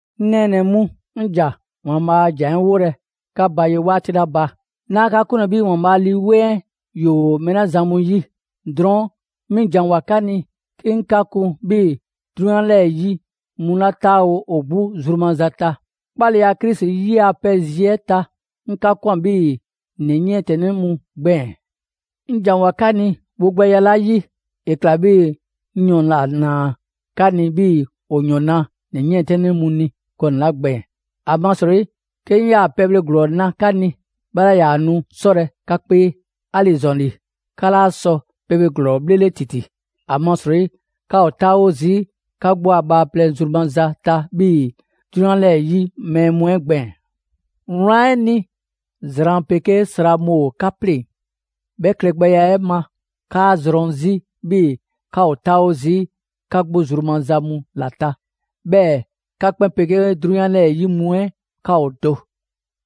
'Ŋ nɛɛnɛ‑ mu, 'ŋ ‑ja ‑Waanbhaa' a ‑jan 'ɛ 'wolɛ‑ 'ka ba ye 'waati 'la ba, 'naa 'ka 'kunlɛ‑ 'bhii‑ ‑Waanbhaa' a Lii 'Weŋ 'ɛ ‑yoo mɛɛ 'la zan mu 'yi. Drɔɔn' 'mi ‑janwoa 'ka ni 'ke 'ŋ 'ka kun 'bhii‑ 'drunyan 'lɛɛ‑ 'yi mu 'la 'taawo‑ ‑o 'gbu zru maza ta. 'Kpaleya Krisi 'yi a pɛ zi 'ɛ ta, 'ŋ 'ka ꞊kwan 'bhii‑ ‑nɛ 'yiɛntɛnnɛ mu gbɛɛn‑. 'Ŋ ‑janwoa 'ka ni wogbɛya 'la 'yi, ‑e ‑kla 'bhii‑ 'ŋ ‑yɔn ‑la ‑naa 'ka ni 'bhii‑ ‑o ‑yɔn na ‑nɛ 'yiɛntɛnnɛ mu ni gɔnɛ‑ 'la gbɛɛn‑. ‑Amasrɔyi 'ke 'ŋ 'yaa‑ pɛbhle ‑glɔɔ na 'ka ni, 'bhɛ 'laa ‑yaa nu 'sɔlɛ‑ 'ka 'kpee. 'Ali‑ ‑zɔn ‑li, 'ka 'laa sɔ pɛbhle ‑glɔɔ 'bhlele ‑titi, ‑amasrɔyi 'ka ‑o 'taawo zii' 'ka 'gbu a bhaaplɛŋ zru maza ta 'bhii‑ 'drunyan 'lɛɛ‑ 'yi mɛɛ mu 'ɛ gbɛɛn‑. Wlan 'ɛ ni, zran 'pegee sra mu ‑o 'ka 'pleŋ‑. 'Bhɛ klɛgbɛya 'ɛ ma, 'kaa‑ zrɔn 'zi 'bhii‑ 'ka ‑o 'taawo zii' 'ka 'gbu zru maza mu ‑la ta, 'bhɛɛ‑ 'ka 'kpɛn 'pegee 'drunyan 'lɛɛ‑ 'yi mu 'ɛ 'ka ‑o do.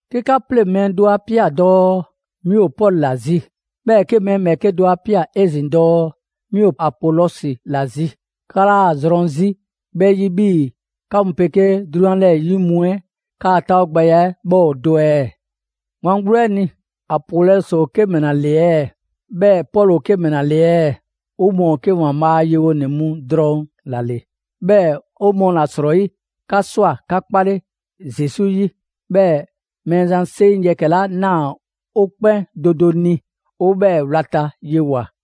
'Ke 'ka 'pleŋ‑ mɛɛ do 'a ꞊pia dɔɔ: «'Mi ‑o Pɔlu ‑la zi». 'Bhɛɛ‑ 'ke mɛɛ 'bhɛɛke do 'a ꞊pia 'ezin‑ dɔɔ: «'Mi ‑o Apolɔsi ‑la zi». 'Ka 'laa‑ zrɔn 'zi 'bhɛ 'yi 'bhii‑ 'ka mu 'pegee 'drunyan 'lɛɛ‑ 'yi mu 'ɛ 'ka 'taawogbɛya 'ɛ 'bhɛ ‑o do ɛɛ? Wlan 'gbu 'ɛ ni, Apolɔsi ‑o 'ke ‑mɛla ‑le ɛɛ? 'Bhɛɛ‑ Pɔlu ‑o 'ke ‑mɛla ‑le ɛɛ? 'O mɔɔ ‑o 'ke ‑Waanbhaa' a yewonɛ mu drɔŋ ‑la ‑le, 'bhɛɛ‑ 'o mɔɔ ‑la 'srɔyi 'ka ꞊swa 'ka 'kpale Zesu 'yi, 'bhɛɛ‑ Mɛɛzan 'seŋ yɛkɛ‑ 'la ꞊naa 'o 'kpɛn do do ni 'o 'bhɛɛ‑ wlata yewoa꞊.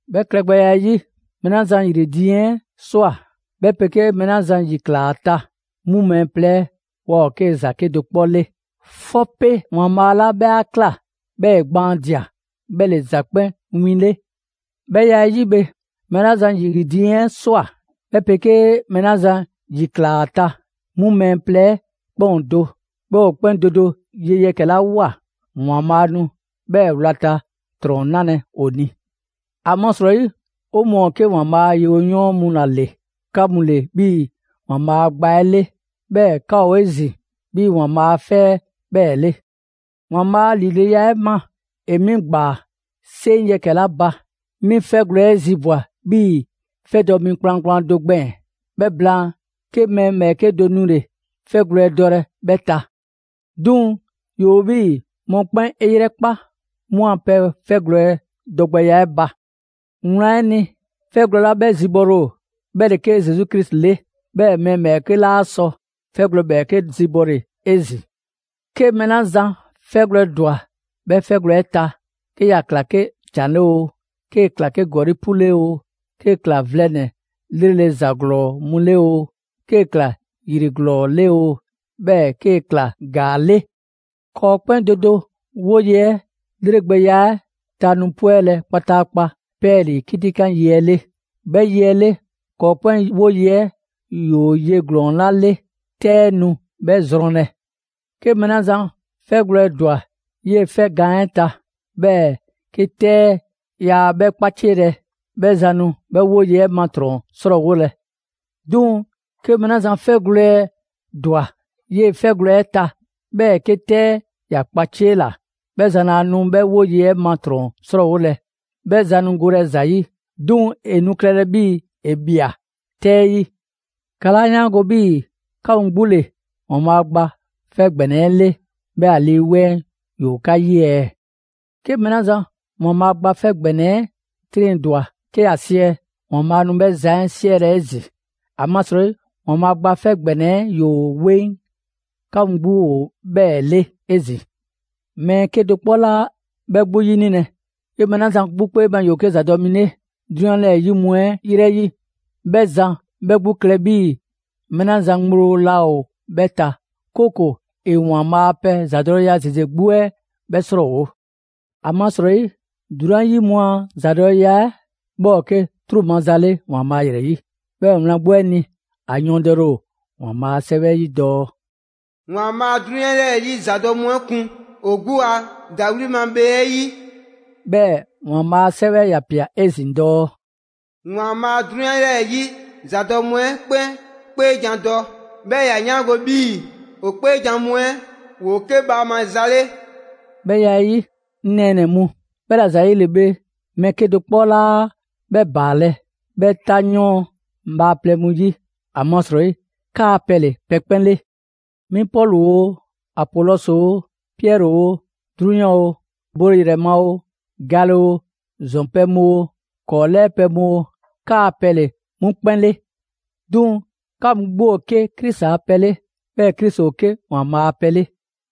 'Bhɛ klɛgbɛya 'ɛ 'yi, mɛɛ 'la zan ‑yri diiŋ 'ɛ ꞊swa, 'bhɛ 'pegee mɛɛ 'la zan ‑yi ꞊klaa ‑a ta, 'mu mɛɛ plɛ 'ɛ waa ‑o 'ke ‑za 'kedo‑ 'kpɔ 'le; 'fɔpe ‑Waanbhaa' 'la 'bhɛ 'a ꞊kla 'bhɛɛ‑ ‑e gbaandia‑, 'bhɛ ‑le ‑za 'kpɛn 'win 'le. 'Bhɛ ya 'ɛ 'yi bhe, mɛɛ 'la zan ‑yri diiŋ 'ɛ ꞊swa, 'bhɛ 'pegee mɛɛ 'la zan ‑yi ꞊klaa ‑a ta, 'mu mɛɛ plɛ 'ɛ 'kpɛn ‑o do. 'Bhɛɛ‑ ‑o 'kpɛn do do ye yɛkɛ‑ 'la ꞊woa, ‑Waanbhaa' nu 'bhɛɛ‑ wlata ‑trɔn 'nalɛ‑ ‑o ni. ‑Amasrɔyi, 'o mɔɔ ‑o 'ke ‑Waanbhaa' a yewoyɔɔn mu ‑la ‑le, 'ka mu ‑le 'bhii‑ ‑Waanbhaa' a gba 'ɛ 'le. 'Bhɛɛ‑ 'ka ‑o 'ezin‑ 'bhii‑ ‑Waanbhaa' a 'fɛ 'bhɛɛ‑ 'le. ‑Waanbhaa' ‑lileya 'ɛ ma ‑e 'mi ꞊gbaa ‑yaa' 'seŋ yɛkɛ‑ 'la ba, 'mi 'fɛgwlɛ‑ 'ɛ zibwa‑ 'bhii‑ 'fɛdɔ‑ mi kplankplan do gbɛɛn‑. 'Bhɛ blaan, 'ke mɛɛ ‑bhɛɛke' do 'nule 'fɛgwlɛ‑ dɔlɛ 'bhɛ ta. 'Duŋ‑ ‑yoo 'bhii‑ mɔkpɛn' 'e 'yrɛkpa 'mu a pɛ 'fɛgwlɛ‑ dɔgbɛya 'ɛ ba. Wlan 'ɛ ni, 'fɛgwlɛ‑ 'la 'bhɛ zibɔle ‑o, 'bhɛ ‑le 'ke Zesu Krisi 'le. 'Bhɛɛ‑ mɛɛ ‑bhɛɛke' 'laa sɔ 'fɛgwlɛ‑ ‑bhɛɛke' zibɔle 'ezin‑. 'Ke mɛɛ 'ke zan 'fɛgwlɛ‑ ‑dwa 'bhɛ 'fɛ gaan 'ɛ ta, 'ke ‑ya ‑kla 'ke ‑can 'le oo, 'kee‑ ꞊kla 'ke ‑gɔli' 'pu 'le oo, 'kee‑ ꞊kla vlɛ ‑nɛ 'lrele‑ ‑za ‑glɔɔ mu 'le oo, 'kee‑ ꞊kla 'ke ‑yri ‑glɔɔ 'le oo, 'bhɛɛ‑ 'kee‑ ‑kla ‑gaa 'le. ‑Kɔɔ' 'kpɛn do do 'woye‑ 'ɛ 'lregbɛya 'ɛ ta nu 'pwɛlɛ‑ kpataakpa 'pɛɛlii‑ 'kitikan yi 'ɛ 'le. 'Bhɛ yi 'ɛ 'le, ‑kɔɔ' 'kpɛn 'woye‑ 'ɛ ‑yoo ye ‑glɔɔn 'la 'le, 'tɛ 'ɛ nu 'bhɛ zrɔnlɛ. 'Ke mɛɛ 'la zan 'fɛgwlɛ‑ ‑dwa 'yee‑ 'fɛ gaan 'ɛ ta, 'bhɛɛ 'ke 'tɛ 'ɛ yaa 'bhɛ 'kpacielɛ; 'bhɛ zan nu 'bhɛ 'woye‑ 'ɛ ma ‑trɔn 'srɔɔwolɛ. 'Duŋ‑ 'ke mɛɛ 'la zan 'fɛgwlɛ‑ ‑dwa 'yee‑ 'fɛ gaan 'ɛ ta, 'bhɛɛ‑ 'ke 'tɛ 'ɛ ‑ya ‑kpaciela; 'bhɛ zan laa nu 'bhɛ 'woye‑ 'ɛ ma ‑trɔn 'srɔɔwolɛ. 'Bhɛ zan nu golɛ ‑za ‑yi, 'duŋ‑ ‑e nu klɛlɛ 'bhii‑ ‑e ꞊mia 'tɛ 'yi. 'Ka 'laa 'yaango 'bhii‑ 'ka mu 'gbu ‑le ‑Waanbhaa' Gba 'Fɛ ‑Gbɛnɛ 'ɛ 'le, 'bhɛɛ‑ ‑a Lii 'Weŋ 'ɛ ‑yoo 'ka 'yi ɛɛ? 'Ke mɛɛ 'la zan ‑Waanbhaa' Gba 'Fɛ ‑Gbɛnɛ 'ɛ 'triŋdwa‑ 'ke ‑ya siɛ, ‑Waanbhaa' nu 'bhɛ zan 'ɛ 'siɛlɛ‑ 'ezin‑. ‑Amasrɔyi ‑Waanbhaa' Gba 'Fɛ ‑Gbɛnɛ 'ɛ ‑yoo 'weŋ, 'ka mu 'gbu ‑o 'bhɛɛ‑ 'le 'ezin‑. Mɛɛ 'kedo‑ 'kpɔ 'laa 'bhɛ 'gbu 'yinilɛ. 'Ke mɛɛ 'la zan 'gbu 'kpee ma, ‑yoo 'ke ‑zadɔ' mi 'le 'drunyan 'lɛɛ‑ 'yi mu 'ɛ 'yrɛ 'yi, 'bhɛ zan 'bhɛ 'gbu klɛ 'bhii‑ mɛɛ 'la zan ŋgblo laa ‑o 'bhɛ ta, 'kooko‑ ‑e ‑Waanbhaa' a pɛ ‑zadɔleya ‑zeze 'gbu 'ɛ 'bhɛ 'srɔɔwo‑. ‑Amasrɔyi, 'drunyan 'yi mu a ‑zadɔleya 'ɛ 'bhɛ ‑o 'ke 'truu‑ maza 'le ‑Waanbhaa' ‑yrɛ 'yi. 'Bhɛɛ‑ wlan 'gbu 'ɛ ni, ‑a yɔɔndɛle ‑o ‑Waanbhaa' a 'Sɛwɛ 'yi dɔɔ: «‑Waanbhaa' 'drunyan 'lɛɛ‑ 'yi ‑zadɔ' mu 'ɛ kun ‑o 'gbu a ‑dawli' ma bhee 'ɛ 'yi.» 'Bhɛɛ‑ ‑Waanbhaa' a 'Sɛwɛ ‑ya ꞊pia 'ezin‑ dɔɔ: «‑Waanbhaa' 'drunyan 'lɛɛ‑ 'yi ‑zadɔ' mu 'ɛ 'kpɛn 'kpeejan‑ dɔ, 'bhɛɛ‑ ‑ya 'yaango‑ 'bhii‑ ‑o 'kpeejan‑ mu 'ɛ ‑woo 'ke bhaama za 'le.» 'Bhɛ ya 'ɛ 'yi, 'ŋ nɛɛnɛ‑ mu, 'bhɛla‑ ‑zayile bhe, mɛɛ 'kedo‑ 'kpɔ 'laa 'bhɛ ‑baalɛ' 'bhɛ 'tanyɔɔn bhaaplɛŋ mu 'yi. ‑Amasrɔyi 'kaa‑ pɛ ‑le pɛ 'kpɛn 'le. 'Mi Pɔlu oo, Apolɔsi oo, Piɛri oo, 'drunyan oo, bole ‑yrɛ ma oo, gale oo, ‑zɔn pɛ mu oo, ‑kɔɔ' 'lɛɛ pɛ mu oo, 'kaa‑ pɛ ‑le 'mu 'kpɛn 'le. 'Duŋ‑ 'ka mu 'gbu ‑o 'ke Krisi a pɛ 'le, 'bhɛɛ‑ Krisi ‑o 'ke ‑Waanbhaa' a pɛ 'le.